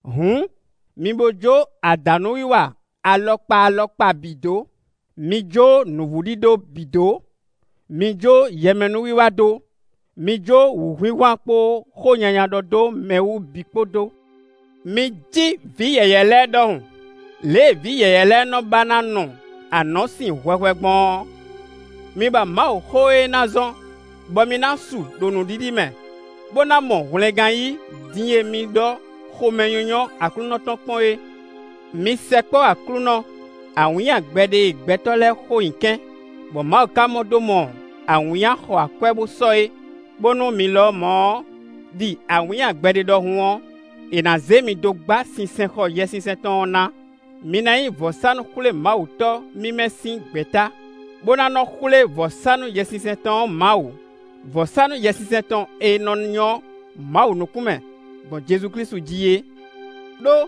Hǔn, mi bo jó adǎnúwiwa alɔkpa alɔkpa bǐ dó; mi jó nǔvúɖíɖó bǐ dó; mi jó yɛmɛnúwiwa dó; mi jó wǔhwinhwan kpó xó nyanya ɖɔ dó mɛ wú bǐ kpó dó. Mi cí vǐ yɛ̌yɛ́ lɛ́ɛ ɖɔhun: lě e vǐ yɛ̌yɛ́ lɛ́ɛ nɔ ba ná nu anɔ̌sin hwɛhwɛ gbɔn ɔ́, mi ba Mawuxó e ná zɔ́n bɔ mi ná su ɖo nǔɖiɖi mɛ, bó ná mɔ hwlɛngán yí din e mi ɖɔ́ xomɛnyínyɔ́ Aklúnɔ tɔn kpɔ́n é. Mi sɛkpɔ́ Aklúnɔ, awǐnnya gbɛɖe e gbɛtɔ́ lɛ́ɛ xo nyi kɛ́n, bɔ Mawu ka mɔ dó mɔ awǐnnya xɔ akwɛ́ bó sɔ́ é, bónú mi lɔmɔ̌ ɔ́, ɖi awǐnnya gbɛɖe ɖɔhun ɔ́, è nǎ zé mi dó gbá sinsɛnxɔ Yɛsinsɛn tɔn ɔ́ ná. Mi ná nyí vɔ̌sánú-xwlémawutɔ́ mímɛ́ sín gbɛ̌ta, bó ná nɔ xwlé vɔ̌sánú Yɛsinsɛn tɔn ɔ́ Mawu; vɔ̌sánú Yɛsinsɛn tɔn e nɔ nyɔ́ Mawu nukún mɛ, gbɔn Jezu Klísu jí é. Đó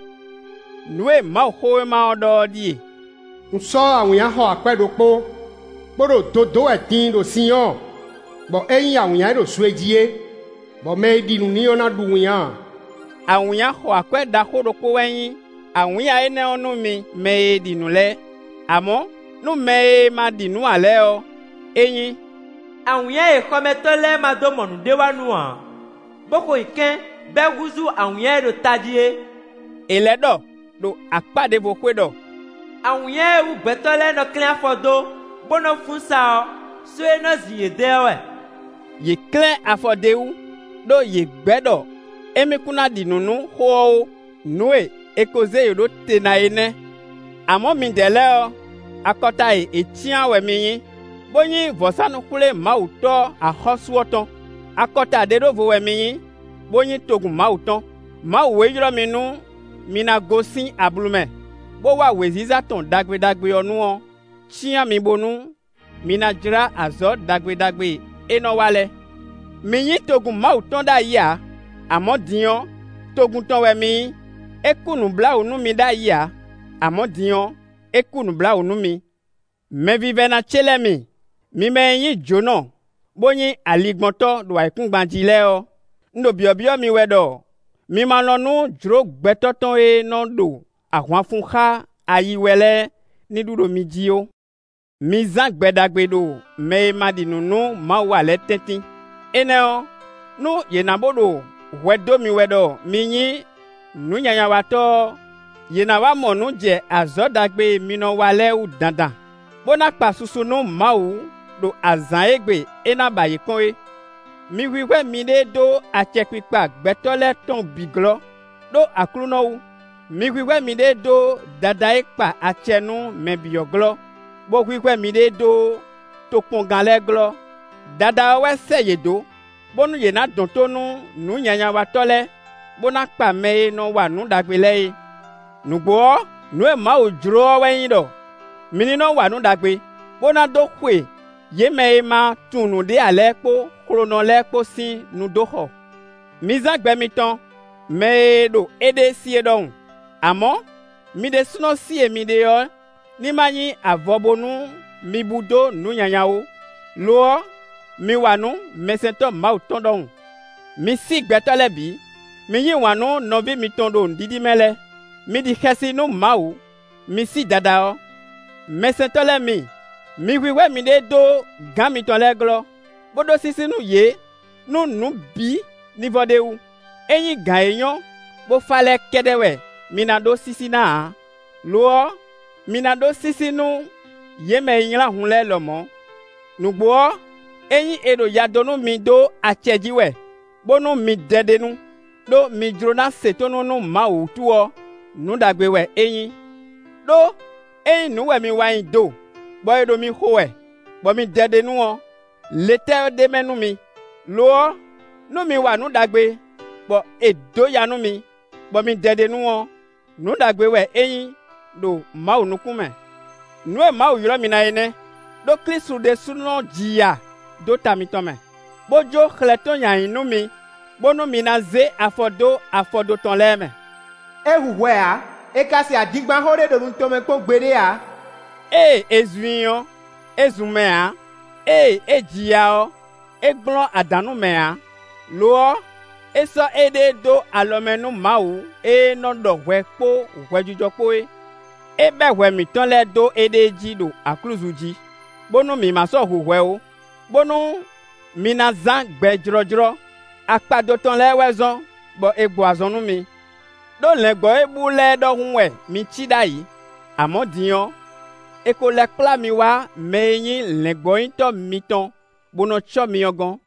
nǔ e Mawuxówéma ɔ́ ɖɔ ɔ́ ɖíe: “Un sɔ́ awǐnnya xɔ akwɛ́ ɖokpó, bó ɖo do dó wɛ din ɖo Sinyɔ́ɔ, bɔ é nyí awǐnnya e ɖo zwe jí é, bɔ mɛ e ɖi nǔ n'i ɔ́ ná ɖu winnyá ǎ.” Awǐnnya xɔ akwɛ́ ɖaxó ɖokpó wɛ nyí awǐnnya énɛ́ ɔ́ nú mi mɛ e ɖi nǔ lɛ́ɛ; amɔ̌ nú mɛ e ma ɖi nǔ ǎ lɛ́ɛ ɔ́, é nyí: “Awǐnnya e xɔmɛtɔ́ lɛ́ɛ ma dó mɔ nǔɖéwanú ǎ, bó xo nyi kɛ́n, bɔ é húzú awǐnnya e ɖo tají é”. È lɛ́ ɖɔ ɖo akpá ɖěvo xwé ɖɔ: “Awǐnnya e wú gbɛtɔ́ lɛ́ɛ nɔ klɛ́n afɔ dó, bó nɔ́ fún sa ɔ́, só e nɔ zin yě dɛ́ ɔ́ wɛ.” Yě klɛ́n afɔ d'é wú, ɖó yě gbɛ́ ɖɔ émí kún ná ɖi nǔ nú xó ɔ́ ó; nǔ e è ko zé yě ɖó te ná é nɛ́. Amɔ̌ midɛɛ lɛ́ɛ ɔ́, akɔta e è cyán ɔ́ wɛ mi nyí, bó nyí vɔ̌sánú-xwlémawutɔ́ axɔ́sú ɔ́ tɔn; akɔta ɖe ɖó vo wɛ mi nyí, bó nyí togun Mawu tɔn. Mawu e ylɔ́ mi nú mi ná gosín ablu mɛ, bó wá wěziza tɔn ɖagbe ɖagbe ɔ́ nu ɔ́ cyán mi bónú mi ná jlá azɔ̌ ɖagbe ɖagbe e é nɔ wa lɛ́ɛ. Mi nyí togun Mawu tɔn ɖ'ayǐ ǎ; amɔ̌ din ɔ́, togun tɔn wɛ mi nyí; é kú nǔbláwǔ nú mi ɖ'ayǐ ǎ; amɔ̌ din ɔ́, é kú nǔbláwǔ nú mi. Mɛvívɛ́ná ce lɛ́ɛ mi, mi mɛ e nyí jǒnɔ bó nyí aligbɔntɔ́ ɖo ayǐkúngban jí lɛ́ɛ ɔ́, un ɖo byɔ̌byɔ́ mi wɛ ɖɔ mi ma lɔn nú jlǒ gbɛtɔ́ tɔn e nɔ ɖo ahwan fun xá ayi wɛ lɛ́ɛ ní ɖu ɖo mi jí ó. Mi zán gbɛ ɖagbe ɖo mɛ e ma ɖi nǔ nú Mawu ǎ lɛ́ɛ tɛ́ntin; énɛ́ ɔ́, nú yě na bo ɖo hwɛ dó mi wɛ ɖɔ mi nyí nǔnyanyawatɔ́ ɔ́, yě ná wá mɔ nǔ jɛ azɔ̌ ɖagbe e mi nɔ wa lɛ́ɛ wú dandan, bó ná kpa susu nú Mawu ɖo azǎn e gbe é ná ba yě kpɔ́n é. Mi hwíhwɛ́ miɖée dó acɛkpikpa gbɛtɔ́ lɛ́ɛ tɔn bǐ glɔ́, ɖó Aklúnɔ wú: mi hwíhwɛ́ miɖée dó Dadá e kpa acɛ nú mɛ bǐ ɔ́ glɔ́, bó hwíhwɛ́ miɖée dó tokpɔngán lɛ́ɛ glɔ́; Dadá ɔ́ wɛ sɛ́ yě dó, bónú yě ná dɔn tó nú nǔnyanyawatɔ́ lɛ́ɛ, bó ná kpa mɛ e nɔ wa nǔ ɖagbe lɛ́ɛ é. Nǔgbó ɔ́, nǔ e Mawu jló ɔ́ wɛ nyí ɖɔ mi ní nɔ wa nǔ ɖagbe, bó ná dó xwe yě mɛ e ma tunwun nǔɖé ǎ lɛ́ɛ kpó xlonɔ lɛ́ɛ kpó sín nu dó xɔ. Mi zán gbɛ mitɔn mɛ e ɖo éɖée sí é ɖɔhun; amɔ̌ mi ɖésúnɔ sí e mi ɖe ɔ́ ní ma nyí avɔ bónú mi bú dó nǔ nyanya ó; lo ɔ́, mi wa nǔ mɛsɛntɔ́ Mawu tɔn ɖɔhun. Mi sí gbɛtɔ́ lɛ́ɛ bǐ; mi yí wǎn nú nɔví mitɔn ɖo nǔɖiɖi mɛ lɛ́ɛ; mi ɖi xɛsi nú Mawu; mi sí Dadá ɔ́. Mɛsɛntɔ́ lɛ́ɛ mi, mi hwíhwɛ́ miɖée dó gǎn mitɔn lɛ́ɛ glɔ́, bó ɖó sísí nú yě nú nǔ bǐ ní vɔ ɖ'é wú; é nyí gǎn e nyɔ́, bó fá lɛ́ɛ kɛ́ɖɛ́ wɛ mi ná ɖó sísí ná ǎ; lo ɔ́, mi ná ɖó sísí nú yě mɛ e nylá hun lɛ́ɛ lɔmɔ̌. Nǔgbó ɔ́, ényí è ɖo ya dó nú mi dó acɛ jí wɛ, bónú mi dɛ ɖ'é nu, ɖó mi jló ná se tónú nú Mawu wútu ɔ́, nǔ ɖagbe wɛ é nyí. Đó ényí nǔ wɛ mi wa nyi do, bɔ è ɖo mi xo wɛ, bɔ mi dɛ ɖ'é nu ɔ́, le tɛ́ wɛ ɖ'é mɛ nú mi? Lo ɔ́, nú mi wa nǔ ɖagbe bɔ è dǒ ya nú mi, bɔ mi dɛ ɖ'é nu ɔ́, nǔ ɖagbe wɛ é nyí ɖo Mawu nukún mɛ. Nǔ e Mawu ylɔ́ mi na é nɛ́; ɖó Klísu ɖésúnɔ ji ya dó ta mitɔn mɛ, bó jó xlɛ́ tɔn nyi ayǐ nú mi, bónú mi ná zé afɔ dó afɔdo tɔn lɛ́ɛ mɛ. É hu hwɛ ǎ, è ka se adingbanxó ɖé ɖo nu tɔn mɛ kpɔ́n gbeɖé ǎ. Ée è zun i ɔ́, é zun mɛ ǎ; ée é ji ya ɔ́, é gblɔ́n adǎn nú mɛ ǎ; lo ɔ́, é sɔ́ éɖée dó alɔ mɛ nú Mawu e nɔ ɖɔ hwɛ kpó hwɛjijɔ kpó é. É bɛ́ hwɛ mǐtɔn lɛ́ɛ dó éɖée jí ɖo aklúzu jí, bónú mi ma sɔ́ hu hwɛ ó, bónú mi ná zán gbɛ jlɔ́jlɔ́. Akpado tɔn lɛ́ɛ wɛ zɔ́n bɔ è gbɔ azɔn nú mi. Đó lɛ̌ngbɔ́ e bú lɛ́ɛ ɖɔhun wɛ mi cí ɖ'ayǐ; amɔ̌ din ɔ́, è ko lɛ́ kplá mi wá mɛ e nyí lɛ̌ngbɔ́nyitɔ́ mitɔn, bó nɔ cɔ́ mi ɔ́ gɔ́n.